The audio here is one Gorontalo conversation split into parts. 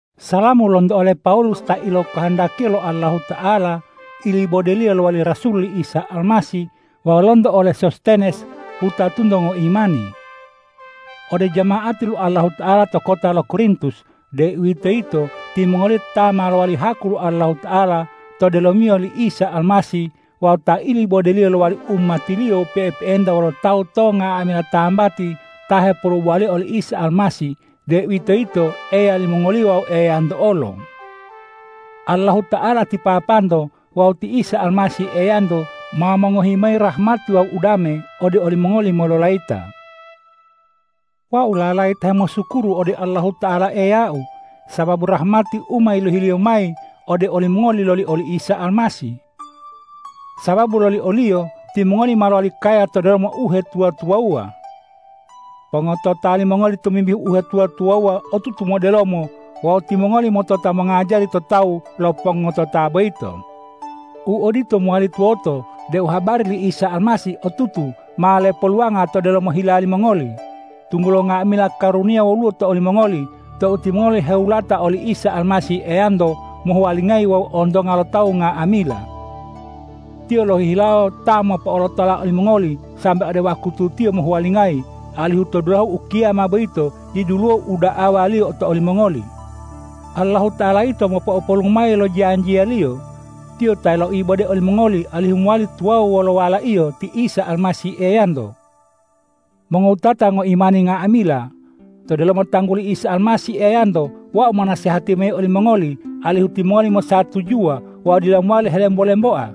Salamu lonto ole Pawulus ta ilokohondakiya lo Allahuta'ala ilibode-Liyo lowali rasul li Isa Almasih wawu lonto ole Sostenes wutatunto ngoimani ode jama'ati lo Allahuta'ala to kota lo Korintus, deuwitoyito timongoliyo ta ma lowali haku lo Allahuta'ala to delomiyo li Isa Almasih wawu ta ilibode-Liyo lowali umati-Liyo pe'epe'enta wolo tawu to nga'amila tambati ta hepolubowa oli Isa Almasih, deuwitoyito Eya limongoliyo wawu Eyanto olo. Allahuta'ala ti Papanto wawu ti Isa Almasih Eyanto ma mongohi mayi rahmati wawu udame ode olimongoli mololayita. Wau lalayita hemosukuru ode Allahuta'ala Eyau, sababu rahmati u ma yilohi-Liyo mayi ode olimongoli loli oli Isa Almasih. Sababu loli o-Liyo timongoli ma lowali kaya to delomo uhetuwa-tuwawuwa. Pongotota limongoli tomimbihu uhetuwa-tuwawuwa otutu modelomo wawu timongoli motota mongajari to tawu lo pongotota boyito. U odito mowali tuwoto deu habari li Isa Almasih otutu ma lepoluwanga to delomo hila limongoli, tunggulo nga'amila karuniya woluwo to olimongoli tou timongoli hewulata oli Isa Almasih Eyanto mohuwalingayi wawu ontonga lo tawu nga'amila. Tiyo lohihilawo ta mopo'olotola olimongoli sambe ode wakutu Tiyo mohuwalingayi, alihu to dulahu ukiyama boyito diduluwo u da'awa-Liyo to olimongoli. Allahuta'ala yito mopo'opolu mayi lo janjiya-Liyo. Tiyo ta loibode olimongoli alihu mowali tuwawu wolo Wala-Iyo ti Isa Almasih Eyanto. Mongowutata ngoimani nga'amila! To delomo tangguli Isa Almasih Eyanto wau monasehati mayi olimongoli alihu timongoli mosatujuwa wawu dila mowali helembo-lemboa.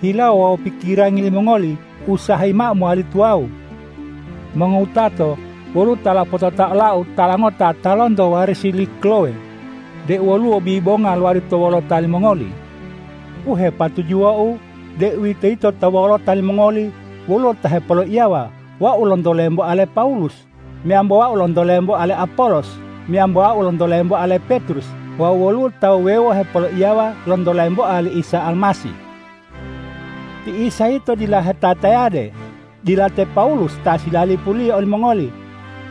Hilawo wawu pikirangi limongoli usahayi mao mowali tuwawu. Mongowutato, woluwo ta lopotota olau tala ngota ta lonto warisi li Klowe deu woluwo bibonga lowali to wolota limongoli. U hepatujuwou, deuwitoyito to wolota limongoli woluwo ta hepoloiyawa, wau lonto lemboa le Pawulus, meyambo wau lonto lemboa le Apolos, meyambo wau lonto lemboa le Petrus wawu woluwo ta wuwewo hepoloiyawa lonto lemboa li Isa Almasih. Ti Isa yito dila hetaya-tayade. Dila te Pawulus ta silalipuliyo olimongoli.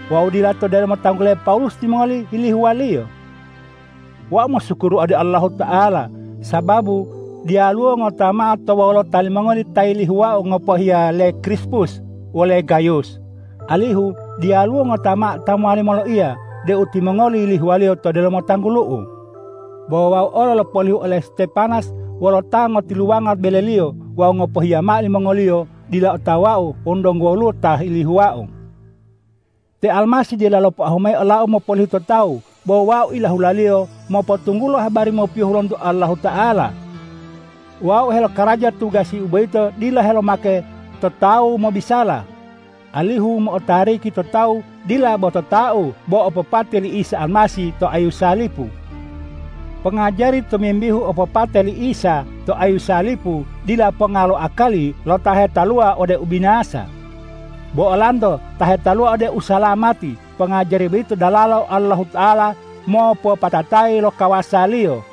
Wawu dila to delomo tanggule Pawulus timongoli yilihuwaliyo. Wau mosukuru ode Allahuta'ala, sababu diyaluwo ngota mao to wolota limongoli ta yilihuwau ngopohiya le Krispus wole Gayus, alihu diyaluwo ngota mao ta mowali moloiya deu timongoli yilihuwaliyo to delomo tanggulu'u. Bo wau olo lopolihu ole Stepanas wolo ta ngotiluwango beleliyo wawu ngopohiya mao limongoliyo dila otawau wonu donggo woluwo ta yilihuwau. Te Almasih dila lopoahu mayi olau mopolihu to tawu, bo wau ilahula-Liyo mopotunggulo habari mopiyohu lonto Allahuta'ala. Wau helokaraja tugasi boyito dila helomake totau mobisala, alihu u mo'otariki to tawu dila bo totau bo opopate li Isa Almasih to ayu salipu. Pongajari tomimbihu opopate li Isa to ayu salipu dila ponga lo akali lo ta hetaluwa ode ubinasa; bo olanto ta hetaluwa ode usalamati, pongajari boyito dalalo Allahuta'ala mopopatatayi lo kawasa-Liyo.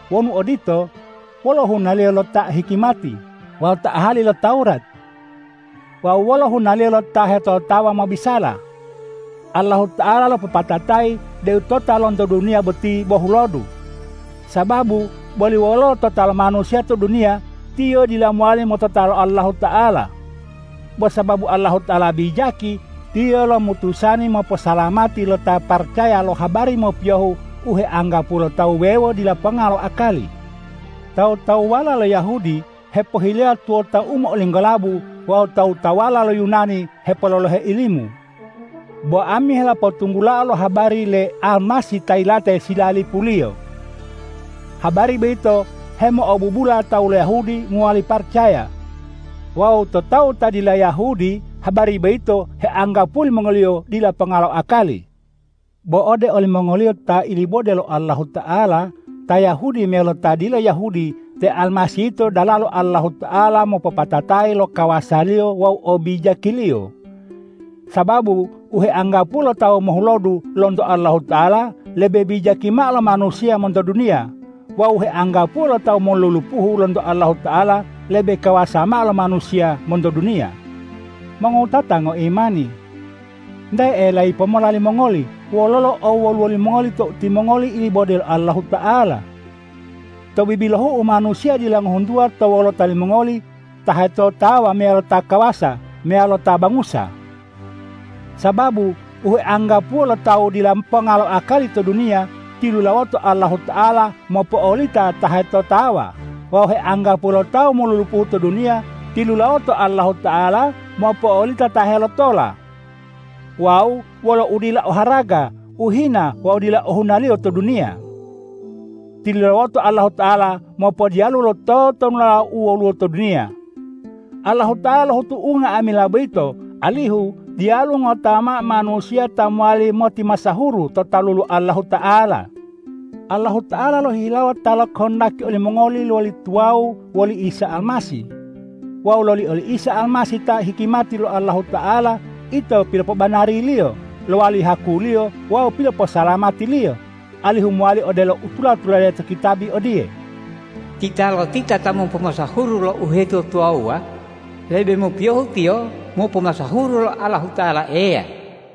Wonu odito, wolo hunaliyo lo ta o hikimati wawu ta ahali lo Tawurat? Wawu wolo hunaliyo lo ta hetotawa mobisala? Allahuta'ala lopopatatayi deu tota lonto duniya boti bo hulodu. Sababu boli wololo tota lo manusiya to duniya, tiyo dila mowali motota lo Allahuta'ala. Bo sababu Allahuta'ala bijaki, Tiyo lomutusani moposalamati lo ta paracaya lo habari mopiyohu u heanggapuwo lo tawu wuwewo dila ponga lo akali. Tawu-tawuwala lo Yahudi hepohileya tuwota u mo'olinggolabu wawu tawu-tawuwala lo Yunani hepololohe ilimu; bo ami helopotunggulao lo habari le Almasih ta yilate silalipuliyo. Habari boyito hemo'obubula tawu lo Yahudi mowali paracaya. Wawu to tawu ta dila Yahudi, habari boyito heanggapuwo limongoliyo dila ponga lo akali. Bo ode olimongoliyo ta ilibode lo Allahuta'ala, ta Yahudi meyalo ta dila Yahudi, te Almasih yito dalalo Allahuta'ala mopopatatayi lo kawasa-Liyo wawu obijaki-Liyo. Sababu u heanggapuwo lo tawu mohulodu lonto Allahuta'ala, lebe bijaki mao lo manusiya monto duniya; wawu u heanggapuwo lo tawu molulupuhu lonto Allahuta'ala, lebe kawasa mao lo manusiya monto duniya. Mongowutata ngoimani! Nte elayi pomola limongoli wololo owoluwo limongoli tou timongoli ilibode lo Allahuta'ala. To bibilohu manusiya dila ngohuntuwa to wolota limongoli ta hetotawa meyalo ta kawasa meyalo ta bangusa. Sababu u heanggapuwo lo tawu dila ponga lo akali to duniya, tilulawoto Allahuta'ala mopo'olita ta hetotawa; wawu u heanggapuwo lo tawu molulupuhu to duniya, tilulawoto Allahuta'ala mopo'olita ta helotola. Wawu wolo udila o haraga, u hina wawu u dila ohunaliyo to duniya, tilulawoto Allahuta'ala mopodiyalu lo totonulala u woluwo to duniya. Allahuta'ala lohutu unga'amila boyito, alihu diyaluwo ngota mao manusiya ta mowali motimasahuru to talu lo Allahuta'ala. Allahuta'ala lohihilawo ta lokohondaki olimongoli lowali tuwawu woli Isa Almasih. Wawu loli oli Isa Almasih ta hikimati lo Allahuta'ala, ito pilopobanari-Liyo, lowali haku-Liyo wawu piloposalamati-Liyo, alihu mowali odelo u tula-tulade to kitabi odiye,”Titalotita ta mopomasahuru lo uhetuwa-tuwawuwa, lebe mopiyohu tiyo mopomasahuru lo Allahuta'ala Eya.”